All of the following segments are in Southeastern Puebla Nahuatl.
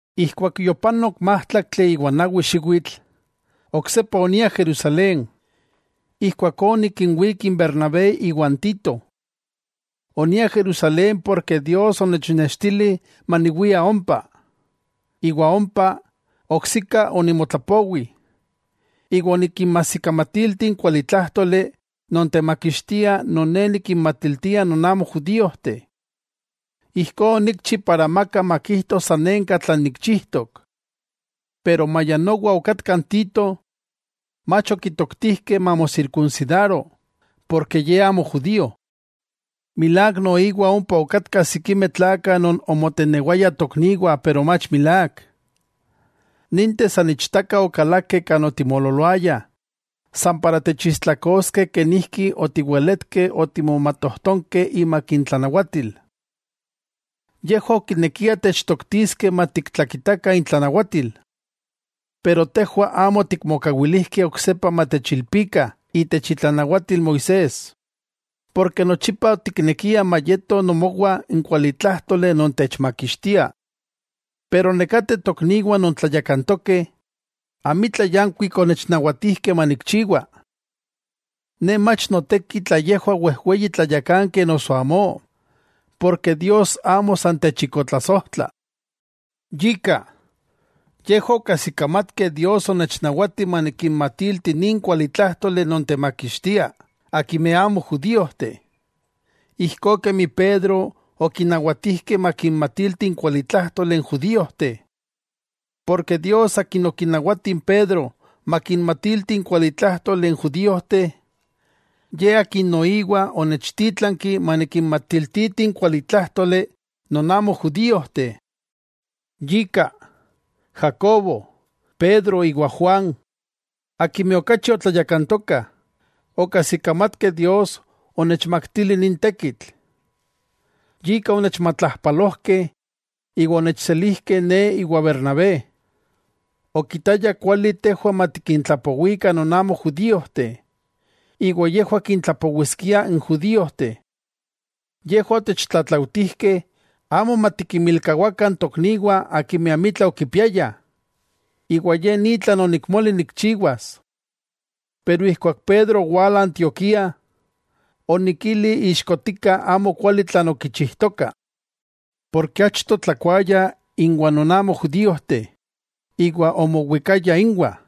Ijkuak yopanok májtlaktli iwa nawi xiwitl, oksepa onia Jerusalén. Ijkuakó onikinwík n Bernabé iwa n Tito. Onia Jerusalén porke Dios onechnextili maniwia ompa. Iwa ompa, oksika onimotlapowi, iwa onikinmajsikamatilti n kualitlájtoli non temakixtia non ne nikinmatiltia non amo judíojteh. Ijkó onikchi para amaka makijto sanenka tlan nikchijtok. Pero maya nowa okatka n Tito, mach okitoktijkeh mamosirkunsidaro, porke ye amo judío. Milák noiwa ompa okatkah sikimeh tlakah non omotenewayah tokniwah pero mach milák. Ninteh san ichtaka okalakeh kan otimoololoayah san para techistlakoskeh kenijki otiweletkeh otimomatojtonkeh imak intlanawatil, yejwah okinekiah techtoktiskeh matiktlakitakah intlanawatil. Pero tejwah amo otikmokawilijkeh oksepa matechilpikah itech itlanawatil Moisés, porke nochipa otiknekiah mayeto nomowah n kualitlájtoli non techmakixtia. Pero nekateh tokniwah non tlayakantokeh, amitla yankuik onechnawatijkeh manikchiwa. Ne mach noteki tla yejwah wejweyi tlayakankeh noso amó, porke Dios amo san techikotlasojtla. Yika, yejwah okajsikamatkeh Dios onechnawati manikinmatilti nin kualitlájtoli non temakixtia, akimeh amo judíojteh, ijkó kemi Pedro okinawatijkeh makinmatiltiti n kualitlájtoli n judíojteh. Porke Dios Akin okinawati n Pedro makinmatiltiti n kualitlájtoli n judíojteh, Ye Akin noiwa onechtítlanki manikinmatiltiti n kualitlájtoli non amo judíojteh. Yika Jacobo, Pedro iwa Juan, akimeh okachi otlayakantokah, okajsikamatkeh Dios onechmaktili nin tekitl, yika onechmatlajpalojkeh iwa onechselijkeh ne iwa Bernabé. Okitayah kuali tejwah matikintlapowikah non amo judíojteh, iwa yejwah kintlapowiskiah n judíojteh. Yejwah otechtlatlautijkeh amo matikinmilkawakah n tokniwah akimeh amitla okipiayah, iwa ye ni tlan onikmoli nikchiwas. Pero ijkuak Pedro owala Antioquía, onikili ixkotika amokuali tlan okichijtoka. Porke achto otlakuaya inwah non amo judíojteh iwa omowikaya inwah,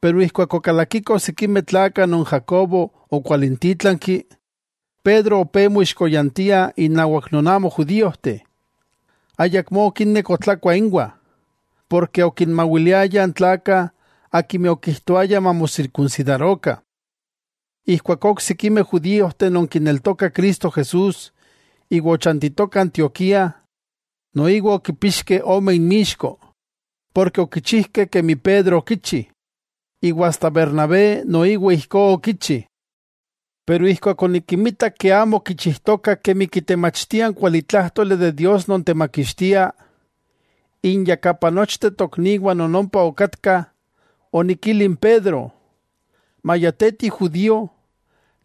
pero ijkuak okalakikoh sikimeh tlakah non Jacobo okwalintítlanki, Pedro opé moixkoyantia innawak non amo judíojteh. Ayakmó okinek otlakua inwah, porke okinmawiliaya n tlakah akimeh okijtoayah mamosirkunsidarokah. Ijkuakó n oksikimeh judíojteh non kineltokah Cristo Jesús iwa ochantitokah Antioquía, noiwa okipixkeh ome inmixko, porke okichijkeh kemi Pedro okichi, iwa asta Bernabé noiwa ijkó okichi. Pero ijkuak onikinmitak amo okichijtokah kemi kitemachtia n kualitlájtoli de Dios non temakixtia, inyakapa nochteh tokniwah non ompa okatkah, onikili n Pedro: “Maya te ti judío,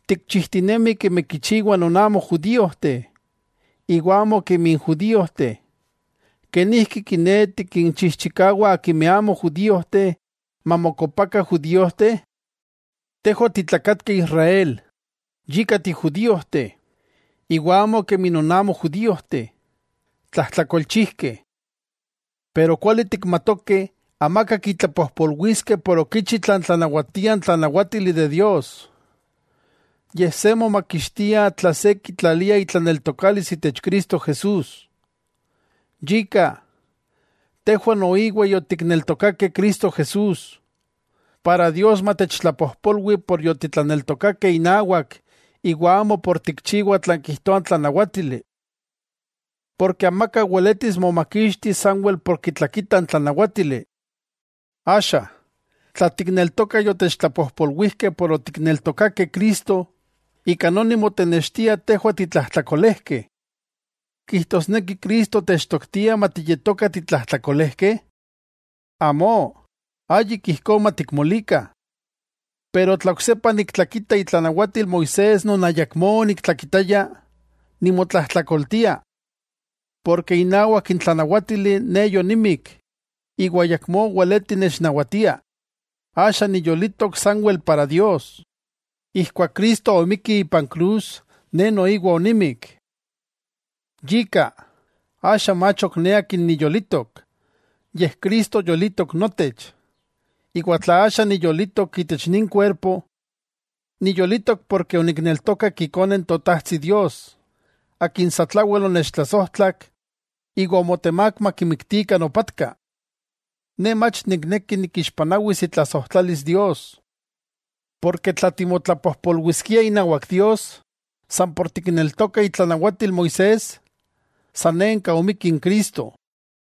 tikchijtinemi kemi kichiwah non amo judíojteh, iwa amo kemi n judíojteh; ¿kenijki kiné tikinchijchikawa akimeh amo judíojteh mamokopakah judíojteh?” Tejwah otitlakatkeh Israel yika tijudíojteh, iwa amo kemi non amo judíojteh, tlajtlakolchijkeh. Pero kuali tikmatokeh amaka kitlapojpolwiskeh por okichi tlan tlanawatia n tlanawátili de Dios, yej se momakixtia tla se kitlalia itlaneltokalis itech Cristo Jesús. Yika, tejwah noiwa yotikneltokakeh Cristo Jesús, para Dios matechtlapojpolwi por yotitlaneltokakeh inawak iwa amo por tikchiwah tlan kijtoa n tlanawátili. Porke amaka weletis momakixtis sanwel por kitlakita n tlanawátili. Axa, tla tikneltokah yotechtlapojpolwijkeh por otikneltokakeh Cristo, ika noni motenextia tejwah titlajtlakolejkeh. ¿Kijtosneki Cristo techtoktia matiyetokah titlajtlakolejkeh? ¡Amó, ayik ijkó matikmolikah! Pero tla oksepa niktlakita itlanawatil Moisés non ayakmó oniktlakitaya, nimotlajtlakoltia. Porke inawak n tlanawátili ne yonimik iwa ayakmó weleti nechnawatia, axa niyolitok sanwel para Dios. Ijkuak Cristo omikki ipan krus ne noiwa onimik. Yika, axa mach ok ne akin niyolitok, yej Cristo yolitok notech. Iwa tla axa niyolitok itech nin kuerpo, niyolitok porke onikneltokak Ikone n Totajtsi Dios, Akin satlawel onechtlasojtlak iwa omotemák makimiktikah nopatka. Ne mach nikneki nikixpanawis itlasojtlalis Dios; porke tla timotlapojpolwiskiah inawak Dios san por tikneltokah itlanawatil Moisés, sanenka omikki n Cristo.